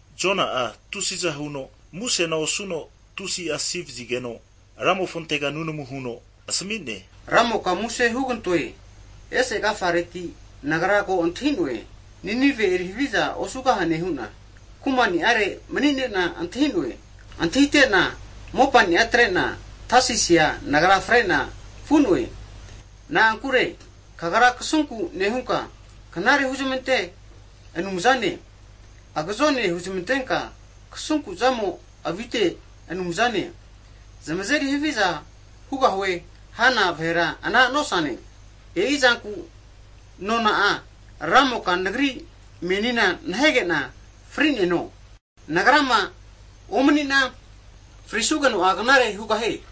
Jona'a tusiza huno musena osuno tusi'a asi vazigeno, Ramofontega nunamu huno asmi'ne. Ramoka muse (plis) hugantoe. Ese agafareti nagra ko antahi'noe, Ninivea eri haviza osugahane hu'na kumani'are mani'nena antahi'noe. Antahite'na mopani'a atre'na, Tasisia nagra fre'na vu'noe! Na'ankure, Kagra kasunku nehunka knare huzmante Anumzane, agzone huzmantenka kasunku'zamo avite Anumzane, zamazeri haviza hugahue hana vahera ana nosane. E'izanku nona'a, Ramoka nagri menina nahege'na fri'neno. Nagrama omni'na, frisugeno'a knare hugahie.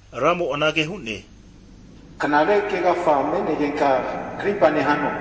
Ramo anage hu'ne, knare kegafa me'negenka krimpa nehano?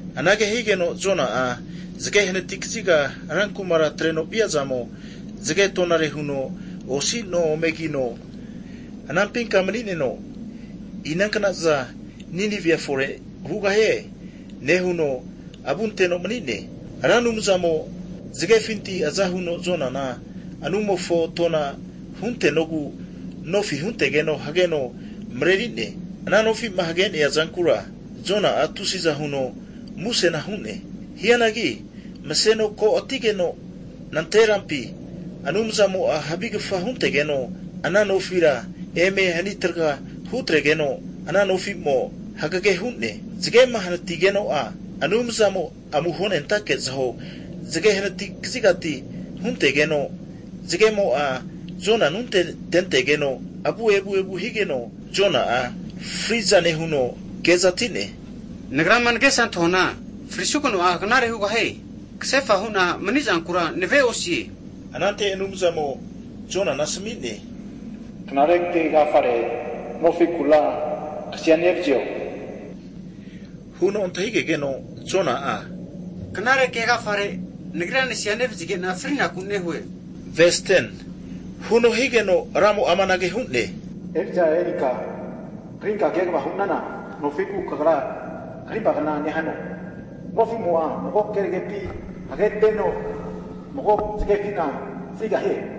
Anage higeno, Jona'a zge hanati kaziga ra kumara atreno via'zamo, zge tonare huno osi no ome kino anampinka mani'neno, inankna'za Ninivea fore hugahie nehuno avu anteno mani'ne. Ra Anumzamo, zgefinti aza huno Jonana anumofo tona huntenogu, nofi huntegeno hgeno mreri'ne, ana nofi'ma hage'nea zankura Jona'a, tusi'za huno musena hu'ne. Hianagi mseno ko'atigeno nanterampi, Anumzamo'a havigfa huntegeno ana nofira eme ani traga hutregeno, ana nofi'mo hagege hu'ne. Zgema hanatigeno'a, Anumzamo amuho nentake zaho, zge hanati kazigati huntegeno, zgemo'a Jona anunte tentegeno, avu evu evu higeno Jona'a fri'za nehuno, kezati'ne, nagrama ngesa antahuana frisugeno'a knare hugahie, ksefa hu'na mani'zankura nave'osie. Anante Anumzamo Jonana asmi'ne, knare ke agafare nofikura kasia nevzio? Huno antahigegeno Jona'a, knare ke agafare nagria nasivazige'na friku nehue. Higeno Ramo amanage hu'ne, eri'za erinka, krinka kegva hu'nana nofiku kagra krimpagna nehano, nofimo'a mago kergepi hageteno mago zgefina frigahie.